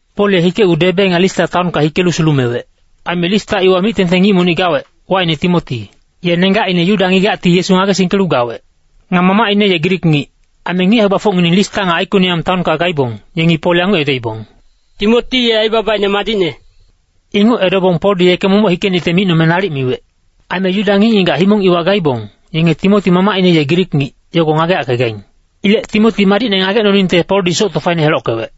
Pol ye hikecgu Debe nga Lista taonka hikelu sulumewec. Aime Lista iwa mic-tengteng ngic monic gawec, wacine Timoti. Ye nenggacine Yuda ngigacti Yesu ngagesingkelu gawec. Nga mamacine ye Grik ngic. Aime ngic hae-gbafocngineng Lista nga Aikoniam taonka gaibong, yengi Pol yanguc edoibong, “Timoti ye aibabaine madicne.” Inguc edobong Poldi yeke momoc hikenicte micnome nalic miwec. Aime Yuda ngic-ngigac himong iwa gaibong, yenge Timoti mamacine ye Grik ngic, yogo ngageyackegaing. Ilec Timoti madicne ngagecnoningte Poldi soc tofaine helockewec.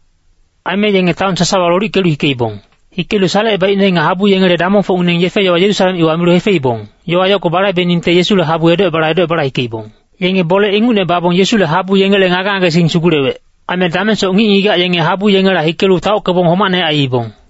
Aime yenge taon sasawa lolickelu hikeibong. Hikelu salecebaicne nga habu yengele damongfocngineng yefe-yowa Yerusalem iwa milu hefeibong, yowa yogo balaibeningte Yesule habu edocebala edocebala hikeibong. Yenge bole inguc babong Yesule habu yengele ngage-ngagesing sugulewec. Aime damengsoc ngic-ngigac yenge habu yengela hikelu taockebong homacne aiibong.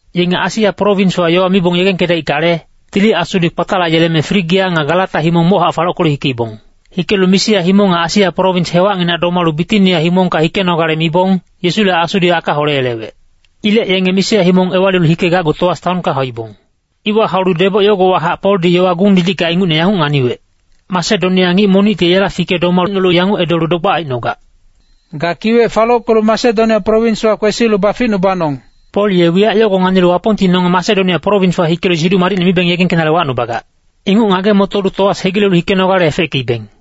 Yenge Asia prowinswa yowa mibong yegengkedaickale, Tili Asudi kpatalayeleme Frigia nga Galata himong mochac falockelu hikeibong. Hikelu Misia himong nga Asia prowins hewacnginac domalu Bitinia himongka hikenogale mibong, Yesule Asudi aka holeyelewec. Ilec yenge Misia himong ewalilu hikegacgu Toas taonka hauibong. Iwa haulu deboc yogowahac Poldi yowa gung-didicka ingucne yanguc nganiwec. Masedonia ngic monicti yela fike domacnolu yanguc edolu dogbac aicnogac, “Ga kiwec falockelu Masedonia prowinswa kwesilu baficnubanong.” Pol ye wiyac yogo nganilu Wapongti nonge Masedonia prowinswa hikelu Siduc Madicne mibeng yegengkenale wacnubagac. Inguc ngage-motolu Toas hegilelu hikenogale efeckeibeng.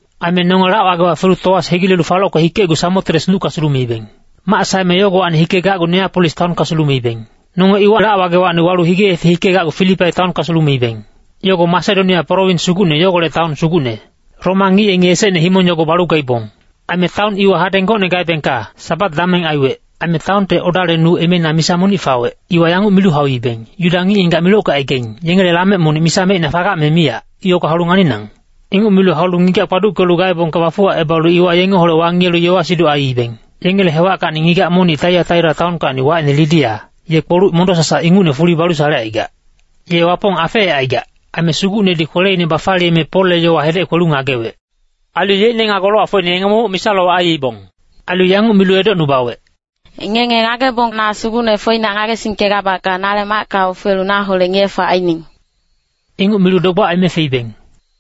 Aime nonge lac-wagewa felu Toas hegilelu falocke hikecgu Samotres nucka sulumeibeng. Mac saeme yogowacni hikegacgu Neapolis taonka sulumeibeng. Nonge iwa lac-wagewacni walu hige-yefe hikegacgu Filipai taonka sulumeibeng. Yogo Masedonia prowins sugucne yogolec taon sugucne. Roma ngic yengi esecne himong yogo balu gaibong. Aime taon iwa hadeng gocne gaebengka Sabat dameng aiwec. Aime taonte odale nu emeina misa monic fawec, iwa yanguc milu hauibeng, “Yuda ngic-ngigac milockecaigaing, yengele lamec monic misa mecina fagac me miyac, yogo haulu nganinang.” Inguc milu haulu ngigac kpaduckelu gaebongka bafuwacebalu iwa yengeholec wangiyelu yowa-siduc aiibeng. Yengele hewackacni ngigac monic Taiataira taonkacni wacine Lidia, ye kpoluc mondo-sasac ingucne fuli balu salecaigac. Ye Wapong afeecaigac, aime Sugucnedi kweleine bafaliyeme Polle yowa hedec kwelu ngagewec. Ailu yeicne nga golowacfocine yenge momoc misa-lowac aiibong. Ailu yanguc milu edocnubawec, “Ngenge ngagebong na Sugucne foinac ngagesingkegabacka, nale macka ofelu naholec ngiye-fac aining.” Inguc milu dogbac aime feibeng.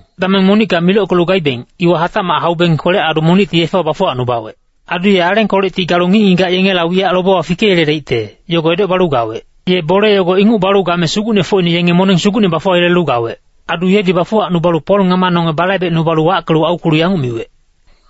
Dameng monicka milockelu gaibeng, iwa hatacmac haubeng kwelec-adu monicti yefewa bafuwacnubawec. Adu ye alengkolecti galu ngic-ngigac yengela wiyac lobewa fikeyeledaicte, yogo edocebalu gawec. Ye bole yogo inguc balu game sugucnefocine yenge moneng sugucne bafuwayelelu gawec. Adu yedi bafuwacnubalu Pol ngama nonge balaibecnubalu wackelu aukwelu yanguc miwec,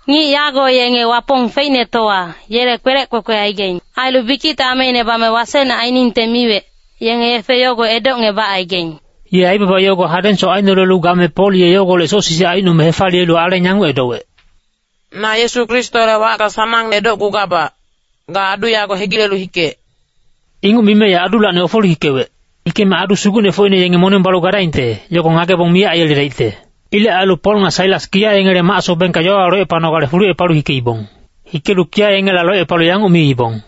“Ngic yago yenge Wapong Feicnetowa, yele kwelec kwekwe aigaing. Ailu bikicte ameine bame wasecne ainingte miwec, yenge yefe yogo edocngebacaigaing.” Ye aibaba yogo hadengsoc ainolelu game Pol ye yogolec soc sisic aicnome hefaliyelu aleng yanguc edowec, “Na Yesu Kristole wacka sanangne edocgugabac, ga adu yago hegilelu hikec.” Inguc mime ye adulacni ofelu hikewec. Hikeme adu sugucnefocine yenge moneng balu gadaingte, yogo ngagebong miyac aiyeledaicte. Ilec ailu Pol nga Sailas kiya yengele mac-sobengka yowawa locepanogale fulucepalu hikeibong. Hikelu kiya yengela locepalu yanguc miibong,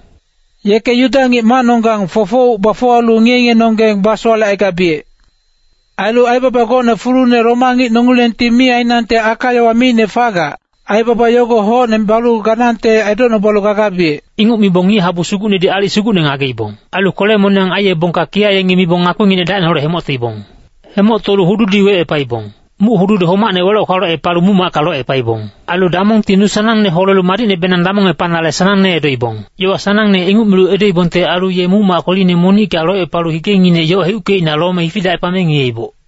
“Yeke Yuda ngic macnonggang fofouc bafuwalu ngiye-ngiyenonggeng basowalecaigabiyec. Ailu aibaba gocne fulune Roma ngic nongilengti mi ainangte aka-yowa miicne fagac, aibaba yogo hocne balu ganangte edocnubalu gagabiyec.” Inguc mibong ngic-habu sugucnedi aalic sugucne ngageibong. Ailu kwele-moniyang aiyebongka kiya yengi mibong ngakpinginec dacineholec hemoctoibong. Hemoctolu hududi wecepaibong. Muc-hududi homacne weloc-kwalocepalu muc-macka locepaibong. Ailu damongti nu sanangne holelu madicnebenang damongepanale sanangne edoibong. Yowa sanangne inguc milu edoibongte ailu ye muc-mac kweline monicka locepalu higenginec yoc heuckeicna lome hifidacepame ngiyeiboc.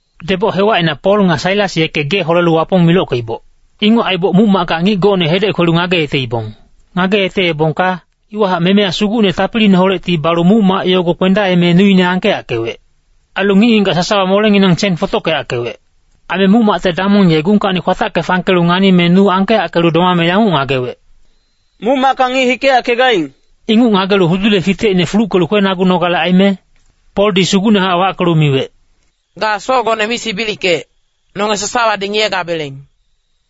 Deboc hewacina Pol nga Sailas yeke gee holelu Wapong milockeiboc. Inguc aiboc muc-macka ngic gocne hedec kwelu ngageyeteibong. Ngageyeteebongka, iwahac memeya sugucne tapiliineholecti balu muc-mac yogo kpendaeme nuine angkeyackewec. Ailu ngic-ngigac sasawa molenginang sen fotockeyackewec. Aime muc-macte damong ye gungkacni kwatacke fangkelu nganime nu angkeyackelu domame yanguc ngagewec, “Muc-macka ngic hikeyackegaing.” Inguc ngagelu hudule fitecine fuluckelu kwenagunale aime, Poldi sugucnehac wackelu miwec, “Ga socgone mi sibilickec, nonge sasawadi ngiyegabeleng.”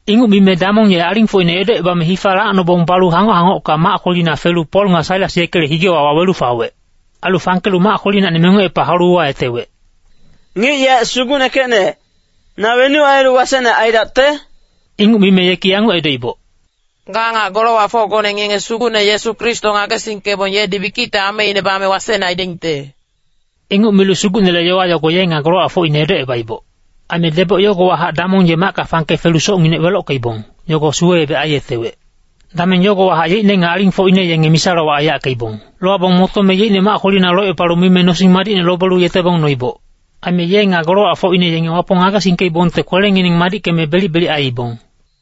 Inguc mime damong ye alingfocine edocebame hifa lacnobong balu hangoc-hangocka mac kwelina felu Pol nga Sailas yekele higewa wawelu fawec. Ailu fangkelu mac kwelinacni mengocepa haulu uwayetewec, “Ngic yaec sugucnekecne, na wenuc ailu wasecne aidacte?” Inguc mime yeki yanguc edoiboc, “Ga nga golowacfocgone ngenge Sugucne Yesu Kristo ngagesingkebong yedi bikicte ameine bame wasecne aidaingte.” Inguc milu Sugucnele yowa yogo ye nga golowacfocine edocebaiboc. Aime deboc yogowahac damong ye macka fangke felu socnginec welockeibong, yogo suwe-ebec aiyetewec. Dameng yagowahac yeicne nga alingfocine yenge misa-lowac aiyackeibong. Lowabong motome yeicne mac kwelina locepalu mime nosing madicne lobelu yetebong noiboc. Aime ye nga golowacfocine yenge Wapong ngagesingkeibongte kwelengineng madickeme belic-belic aiibong.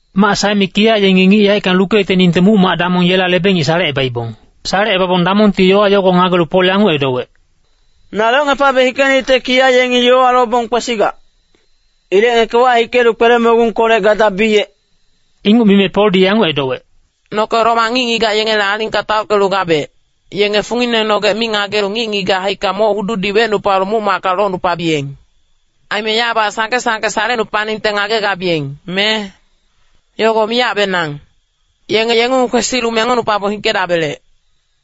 Mac saeme kiya yengi ngic yaeckang lukeyeteningte muc-mac damong yela lebe-ngic salecebaibong. Salecebabong damongti yowa yogo ngagelu Pol yanguc edowec, “Na locngepabe hikenicte kiya yengi yowa lobong kwesigac. Ilec ngeke wahikelu kwele-mogungkolec gadabiyec.” Inguc mime Poldi yanguc edowec, “Noke Roma ngic-ngigac yengele alingka taockelu gabec, yenge funginenonggec mi ngagelu ngic-ngigac haicka moc hududi wecnupalu muc-macka locnupabiyeng. Aime yabac sangke-sangke salecnupaningte ngagegabiyeng, me? Yogo miyacbenang! Yenge yengung kwesilu mengocnupabong hikedabelec.”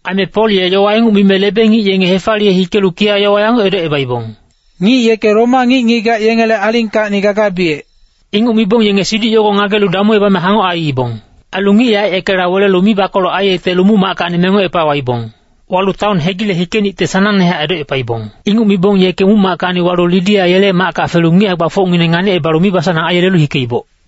Aime Pol ye yowa inguc mime lebe-ngic yenge hefaliye hikelu kiya yowa yanguc edocebaibong, “Ngic yeke Roma ngic-ngigac yengele alingkacnidi gagabiyec.” Inguc mibong yenge siduc yogo ngagelu damuebame hangoc aiibong. Ailu ngic yaec yekela welelu mibakoloc aiyetelu muc-mackacni mengocepa waibong. Walu taon hegile hikenicte sanangnehac edocepaibong. Inguc mibong yeke muc-mackacni walu Lidia yele macka felu ngic hae-gbafocngineng nganicebalu mibasanang aiyelelu hikeiboc.